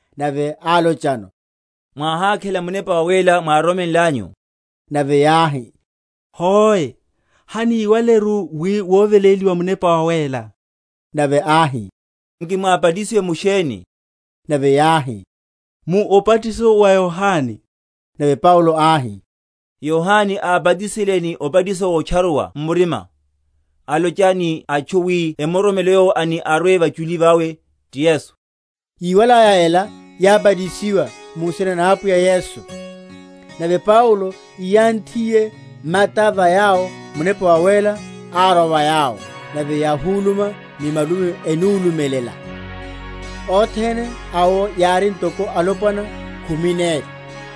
nave álochano, Mwáhákhela Munepa Wawéla mwároromenlanyu? Nave yáhi, Hoe, haníwaleru wi woveléliwa Munepa Wawéla. Nave áhi, Nki mwábatisiwe mu sheni? Nave yáhi, Mu obatiso wa Yohane. Nave Paulo áhi, Yohane ábatisale ni obatiso wotcharuwa m’murima, alocha ni atchu, wi emuroromele Yowo ani arwe vachuli vawe, ti Yesu. Yíwalaya ela, yábatisiwa mu nsina na Apwiya Yesu. Nave Paulo íyanthiye mata va yawo, Munepa Wawéla árwa va yawo; nave yáhuluma ni malumi, enulumelela. Othene awo yári ntoko alopwana khumi neli.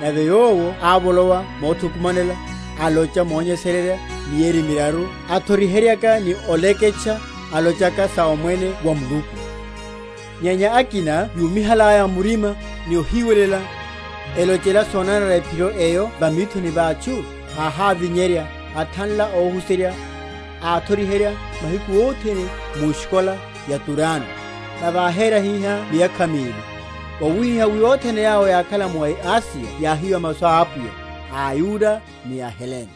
Nave yowo ávolowa mothukumanela, alocha monyesererya, mieri miraru, athoriheryaka ni oleketcha alochaka sa Omwene wa Muluku. Nyenya akina yúmihalaya murima ni ohiwelela, elochela sonanara ephiro eyo va mithoni va atchu, áhávinyerya, athanla óhuserya, áthoriherya mahiku othene mu eskola ya Turano. Nave áhera hihá miyakha mili; wawihiha wi othene yawo yákhala mu Asiya yáhiwa masu a Apwiya, aYuda ni aHelene.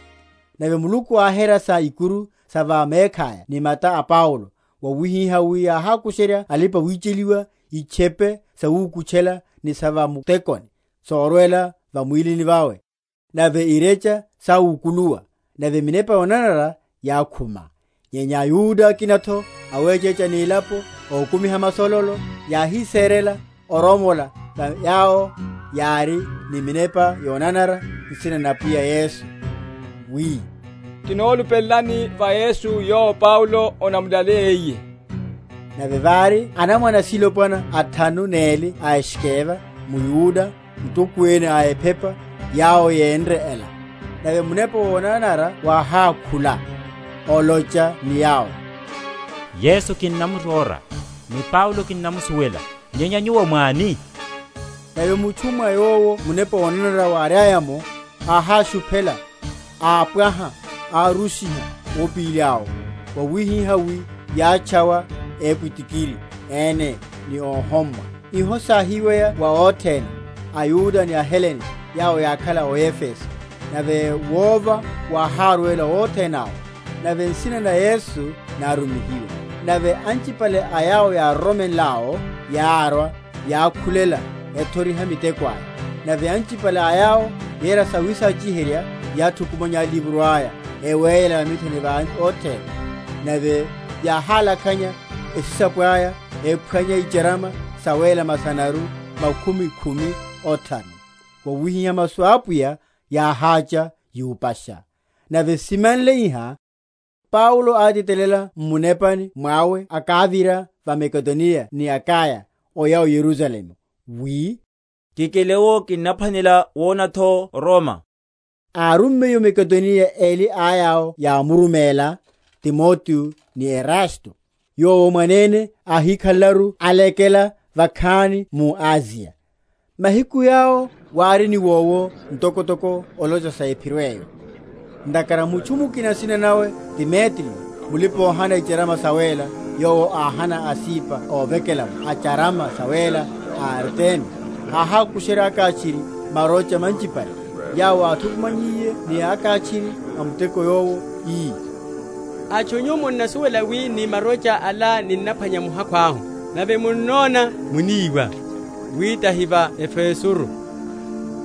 Nave Muluku áhera sa ikuru sa va mekhaya ni mata a Paulo; wawihiha wi yáhákusherya alipa‐wicheliwa itchepe sawukutchela ni sa va mutekoni, sorwela va mwílini vawe, nave irecha sáwukuluwa, ni minepa yonanara yákhuma. Nyenya aYuda akina’tho awechecha ni elapo, ókumiha masololo, yáhiserela oromola va yawo yári ni minepa yonanara nsina na Apwiya Yesu, wi, Kinolupelelani va Yesu yowo Paulo anamulaleyiye. Nave vári anamwane asilopwana athanu neli a Skeva, mYuda, mutokwene a ephepa, yawo yénre ela. Nave munepa wonanara wáhákhula, olocha ni yawo, Yesu kinnamuróra, ni Paulo kinnamusuwela, nyenye nyuwo mwáni? Nave mutchu, mwa yowo munepa wonanara wáriaya’mo, áháshuphela, ápwaha, árushiha ópili awo, wawihiha wi yátchawa épwitikiri ene ni óhommwa. Iho sáhiweya wa othene, aYuda ni aHelene, yawo yákhala o Efeso; nave wova wáhárwela othene awo, nave nsina na Yesu nárumihiwa. Nave anchipale a yawo yároromenl’awo yárwa, yákhulela, ethoriha miteko aya. Nave anchipale a yawo yéra sawisachi?-?herya yáthukumanya alivro aya, eweyela va mithoni va othene; nave yáhálakhanya esisapo aya, ephwanya icharama sawéla masanaru makhumi khumi othanu. Wawihihá masu a Apwiya yáhácha yupasha. Nave simanle iha, Paulo átitelela m’munepani mwawe akávira va Makedoniya ni Akaya, oya o Yerusalemu, wi, Kikele’wo kinnaphwanela wona’tho o Roma. Árummiye o Makedoniya eli a yawo yámuruméla, Timoteo ni Erasto, yowo mwanene áhikhalelaru alekela vakhani mu Asiya. Mahiku yawo wári niwowo ntokotoko olocha sa Ephiro eyo. Ntakhara mutchu mukina nsina nawe Demetriyo mulipa‐óhana icharama sawéla, yowo áhana asipa óvekelela’mo a’charama sawéla a Artemi, áhákusherya akháchiri marocha manchipale; yawo áthukumannyiye ni akháchiri a muteko yowo, ii, Atchu nyu, Munnasuwela wi ni marocha ala ninnaphwanya muhakhu ahu. Nave munnona muníwa, wi tahi va Efesoru,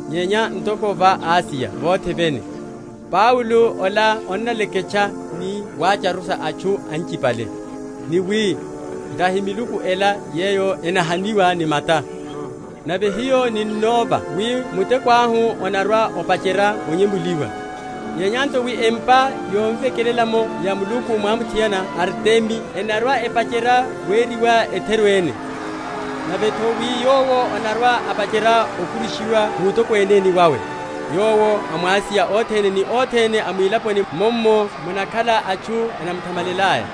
nyenya ntoko va Asiya vothe vene, Paulo ola annaleketcha ni watcharusha atchu anchipale, ni wi, Tahi miluku ela yeyo enahaniwa ni mata: nave hiyo ninnova wi muteko ahu onarwa‐opacherya onyemuliwa; nyenya nto wi empa yovekelela’mo ya muluku mwamuthiana Artemi enarwa‐epacherya weriwa etheru ene; nave’tho wi yowo anarwa‐apacherya okurushiwa wutokweneni wawe, yowo a mu Asiya othene ni othene a mwilaponi mummo munakhala atchu enamuthamalelaya.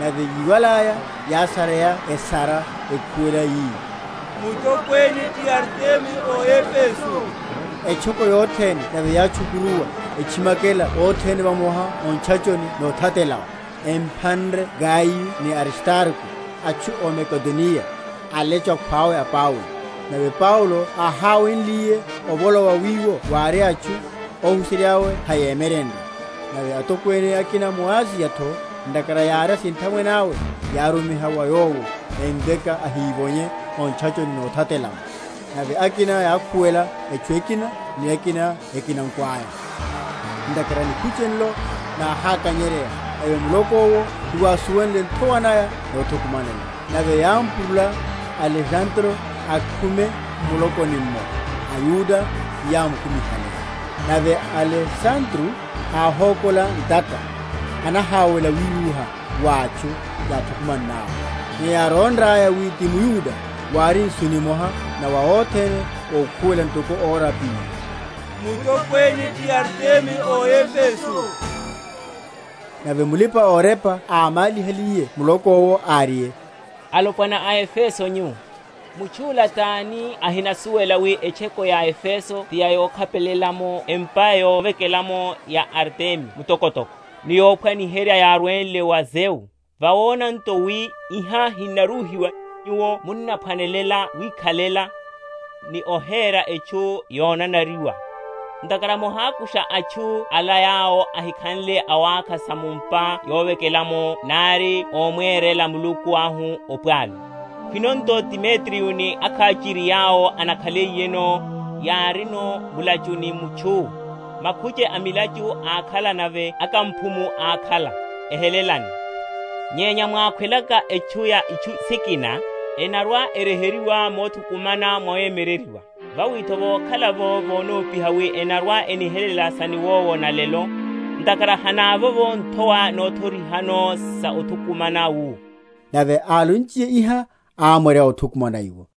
Nave yíwalaya, yásareya esara, ekhuwela, yi, Mutokwene ti Artemi ó Efeso. Etchoko yothene nave yátchukuruwa, etchimakela othene vamoha o ntchachoni nothatela’wo, emphanre Gayo ni Aristarko, atchu ó Makedoniya, alecho akhwawe a Paulo. Nave Paulo áháweliye ovolowa wiwo wári atchu, óhuserya’we heyámwe?-?myerenrye. Nave atokwene akina a mu Asiya’tho, ntakhara yári asinthamwene awe, yárumiha wa yowo, emveka ahívonye o ntchachoni nothatela’mo. Nave akina yákhuwela etchu ekina, ni akina ekinako aya; ntakhara nikhuche nlo náhákanyeryeya; nave muloko’wo hewásuwenle nthowa naya nothukumanela. Nave yámpurula Alesandro akhume m’mulokoni’mmo, aYuda tiyámukumihale. Nave Alesandro áhókola ntata, anaháwela wirúha wa atchu yáthukumann’awo. Nyenya yárónraya wi ti mYuda, wári nsu nimoha na wa othene ókhuwela ntoko ora pili, Mutokwene ti Artemi a aEfeso. Nave mulipa‐orepa ámálihaliye muloko’wo, áriye, Alopwana a Efeso nyu, mutchu’la tani ohinasuwela wi etchoko ya Efeso ti yokhapelela’mo empa yovekelela’mo ya Artemi mutokotoko, ni yophwaniherya yárwenle wa Zeu? Vawona nto wi iha hinaruhiwa, nyuwo munnaphwanela wikhalela, ni ohera etchu yonanariwa. Ntakhara mohakusha atchu ala, yawo ahikhanle awákha sa mu’mpa yovekelela’mo nari ómwerela Muluku ahu opwalu. Khwino nto Demetriyo ni akháchiri yawo anakhaliyeno, yárino mulachu ni mutchu, makhuche a milachu ákhala, nave akamphumu ákhala; ehelelane. Nyenya mwákhwelaka etchu ya itchu sikina, enarwa‐eryeheryiwa muthu?-?kumana wawemyereryiwa. Vawi’tho vokhala’vo vonopiha wi enarwa‐enihelela sa niwowo na’lelo; ntakhara hinavovo nthowa nothorihano sa othukumana wu. Nave álonchiye iha, ámwarya óthukumana iwo.